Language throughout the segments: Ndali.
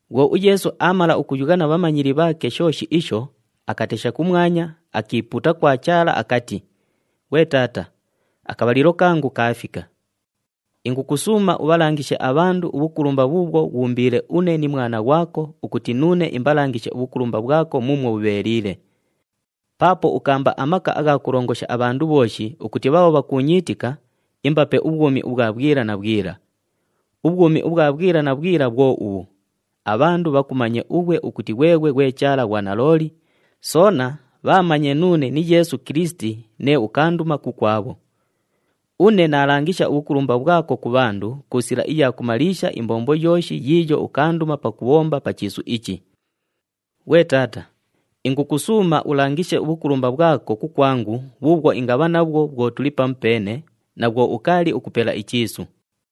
Bhwo uYeesu aamala ukuyugha na bhamanyili bhaake shooshi isho, akatesha kumwanya, akiipuuta kwa Chaala akati, “Ghwe Taata, akabhalilo kangu kaafika. Ingukusuuma ubhalangishe abhandu ubhukulumba bhuubhwo ghuumbiile une ni Mwana ghwako ukuti nuune imbalangishe ubhukulumba bhwako muumwo bhubheeliile. Paapo ukaamba amaka agha kulongosha abhandu bhooshi ukuti bhaabho bhakuunyiitika, imbape ubhwumi ubhwa bhwila na bhwila. Ubhwumi ubhwa bhwila na bhwila bhwo ubhu, abhandu bhakumanye ughwe ukuti ghweghwe ghwe Chaala ghwa nalooli, soona bhaamanye nuune ni Yeesu Kilisiti nee ukaanduma kukwabho. Une naalangisha ubhukulumba bhwako ku bhandu ku sila iya kumaliisha imbombo yooshi yiiyo ukaanduma pakubhomba pa chiisu ichi. Ghwe Taata, ingukusuuma ulangishe ubhukulumba bhwako kukwangu bhuubhwo ingabha nabhwo bhwo tuli pamupeene, na bhwo ukaali ukupela ichiisu.”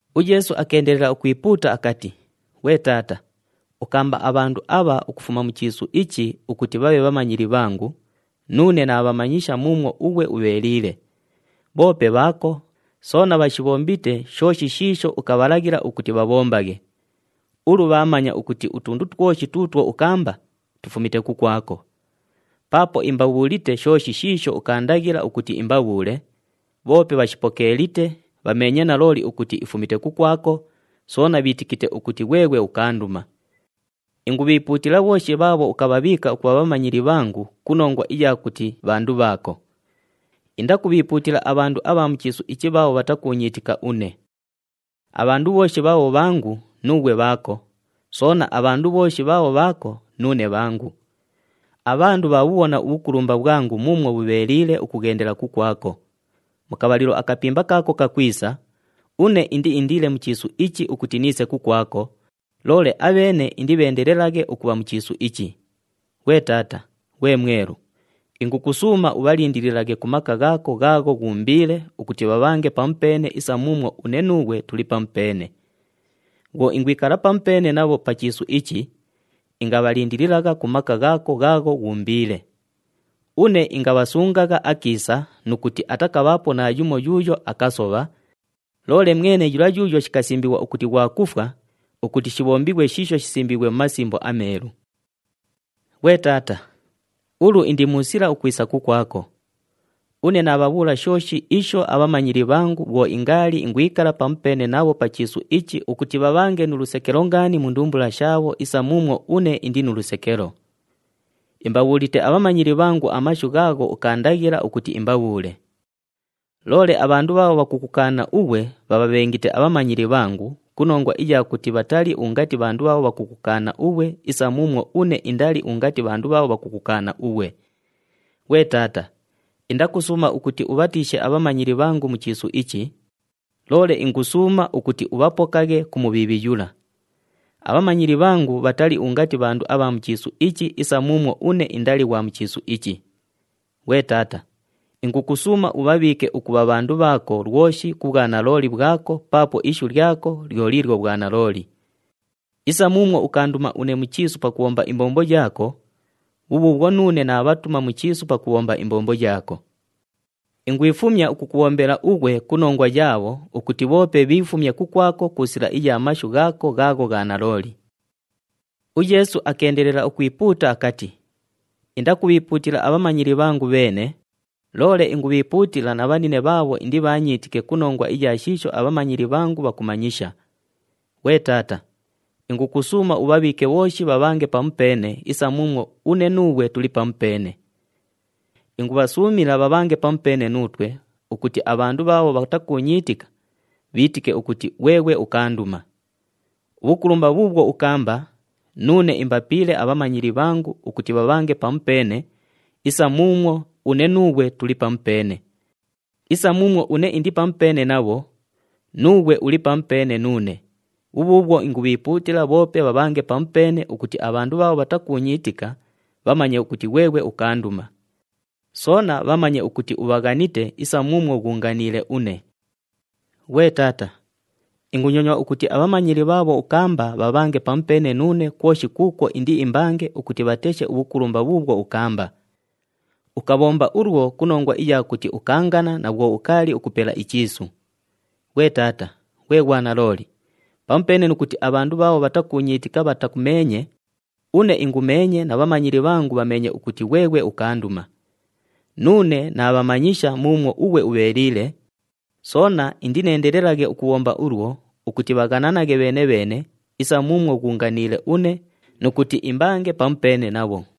UYeesu akeendelela ukwipuuta akati, “Ghwe Taata, ukaamba abhandu abha ukufuma mu chiisu ichi ukuti bhabhe bhamanyili bhangu, nuune naabhamanyisha muumwo ughwe ubheeliile. Bhoope bhaako, soona bhashibhombite shooshi shiisho ukabhalaghila ukuti bhabhombaghe. Ulu bhaamanya ukuti utundu twoshi tuutwo ukaamba, tufumite kukwako. Paapo imbabhuulite shooshi shiisho ukaandaghila ukuti imbabhuule, bhoope bhashipokeelite, bhameenye nalooli ukuti ifumite kukwako, soona bhiitikite ukuti ghweghwe ukaanduma. Ingubhiipuutila bhooshi bhaabho ukabhabhiika ukubha bhamanyili bhangu ku nongwa iya kuti bhandu bhaako. Indakubhiipuutila abhandu abha mu chiisu ichi bhaabho bhatakuunyiitika une. Abhandu bhooshi bhaabho bhangu, nuughwe bhaako, soona abhandu bhooshi bhaabho bhaako, nuune bhangu. Abhandu bhaabhubhona ubhukulumba bhwangu muumwo bhubheeliile ukughendela kukwabho. Mu kabhalilo akapimba kaako kakwisa, une indiindiile mu chiisu ichi ukuti niise kukwako, loole abheene indibheendelelaghe ukubha mu chiisu ichi. Ghwe Taata, ghwe Mwelu, ingukusuuma ubhalindililaghe ku maka ghaako ghaagho ghuumbiile ukuti bhabhange pamupeene isa muumwo une nuughwe tuli pamupeene. Bhwo ingwikala pamupeene nabho pa chiisu ichi, ingabhalindililagha ku maka ghaako ghaagho ghuumbiile. Une ingabhasungagha akiisa nu kuti atakabhaapo naayumo yuuyo akasobha, loole mwene yula yuuyo shikasimbighwa ukuti ghwa kufwa, ukuti shibhombighwe shiisho shisimbiighwe mu Masimbo aMeelu. “Ghwe Taata, ulu indi mu sila ukwisa kukwako. Une naabhabhuula shooshi isho abhamanyili bhangu bhwo ingaali ingwikala pamupeene nabho pa chiisu ichi ukuti bhabhange nu lusekelo ngaani mu ndumbula shaabho isa muumwo une indi nu lusekelo. Imbabhuulite abhamanyili bhangu amashu ghaagho ukaandaghila ukuti imbabhuule. Loole abhandu bhaabho bhakukukaana ughwe bhabhabhengite abhamanyili bhangu, ku nongwa iya kuti bhatali ungati bhandu bhaabho bhakukukaana ughwe, isa muumwo une indali ungati bhandu bhaabho bhakukukaana ughwe. Ghwe Taata, indakusuuma ukuti ubhatiishe abhamanyili bhangu mu chiisu ichi, loole ingusuuma ukuti ubhapokaghe ku Mubhiibhi yula. Abhamanyili bhangu bhatali ungati bhandu abha mu chiisu ichi isa muumwo une indali ghwa mu chiisu ichi. Ghwe Taata, ingukusuuma ubhabhiike ukubha bhandu bhaako lwoshi ku bhwanalooli bhwako paapo ishu lyako lyo liilyo bhwanalooli. Isa muumwo ukaanduma une mu chiisu pakubhomba imbombo yaako, bhubhuubhwo nuune naabhatuma mu chiisu pakubhomba imbombo yaako. Ingwifumya ukukubhombela ughwe ku nongwa yaabho ukuti bhoope bhiifumye kukwako ku sila iya mashu ghaako ghaagho gha nalooli.” UYeesu akeendelela ukwipuuta akati, “Indakubhiipuutila abhamanyili bhangu bheene, loole ingubhiipuutila na bhanine bhaabho indibhaanyiitike ku nongwa iya shiisho abhamanyili bhangu bhakumanyisha. Ghwe Taata, ingukusuuma ubhabhiike bhooshi bhabhange pamupeene isa muumwo une nuughwe tuli pamupeene. Ingubhasuumila bhabhange pamupeene nuutwe ukuti abhandu bhaabho bhatakuunyiitika, bhiitike ukuti ghweghwe ukaanduma. Ubhukulumba bhuubhwo ukaamba, nuune imbapiile abhamanyili bhangu ukuti bhabhange pamupeene isa muumwo une nuughwe tuli pamupeene. Isa muumwo une indi pamupeene nabho, nuughwe uli pamupeene nuune, bhubhuubhwo ingubhiipuutila bhoope bhabhange pamupeene ukuti abhandu bhaabho bhatakuunyiitika bhamanye ukuti ghweghwe ukaanduma. Soona bhamanye ukuti ubhaghanite isa muumwo ghuunganiile une. “Ghwe Taata, ingunyonywa ukuti abhamanyili bhaabho ukaamba bhabhange pamupeene nuune kwoshi kuukwo indiimbange ukuti bhateshe ubhukulumba bhuubhwo ukaamba. Ukabhomba ulwo ku nongwa iya kuti ukaangana na bhwo ukaali ukupela ichiisu. Ghwe Taata, ghwe ghwanalooli, pamupeene nu kuti abhandu bhaabho bhatakuunyiitika bhatakumeenye, une ingumeenye na bhamanyili bhangu bhameenye ukuti ghweghwe ukaanduma. Nuune naabhamanyisha muumwo ughwe ubheeliile, soona indineendelelaghe ukubhomba ulwo ukuti bhaghananaghe bheene-bheene isa muumwo ghuunganiile une nu kuti imbange pamupeene nabho.”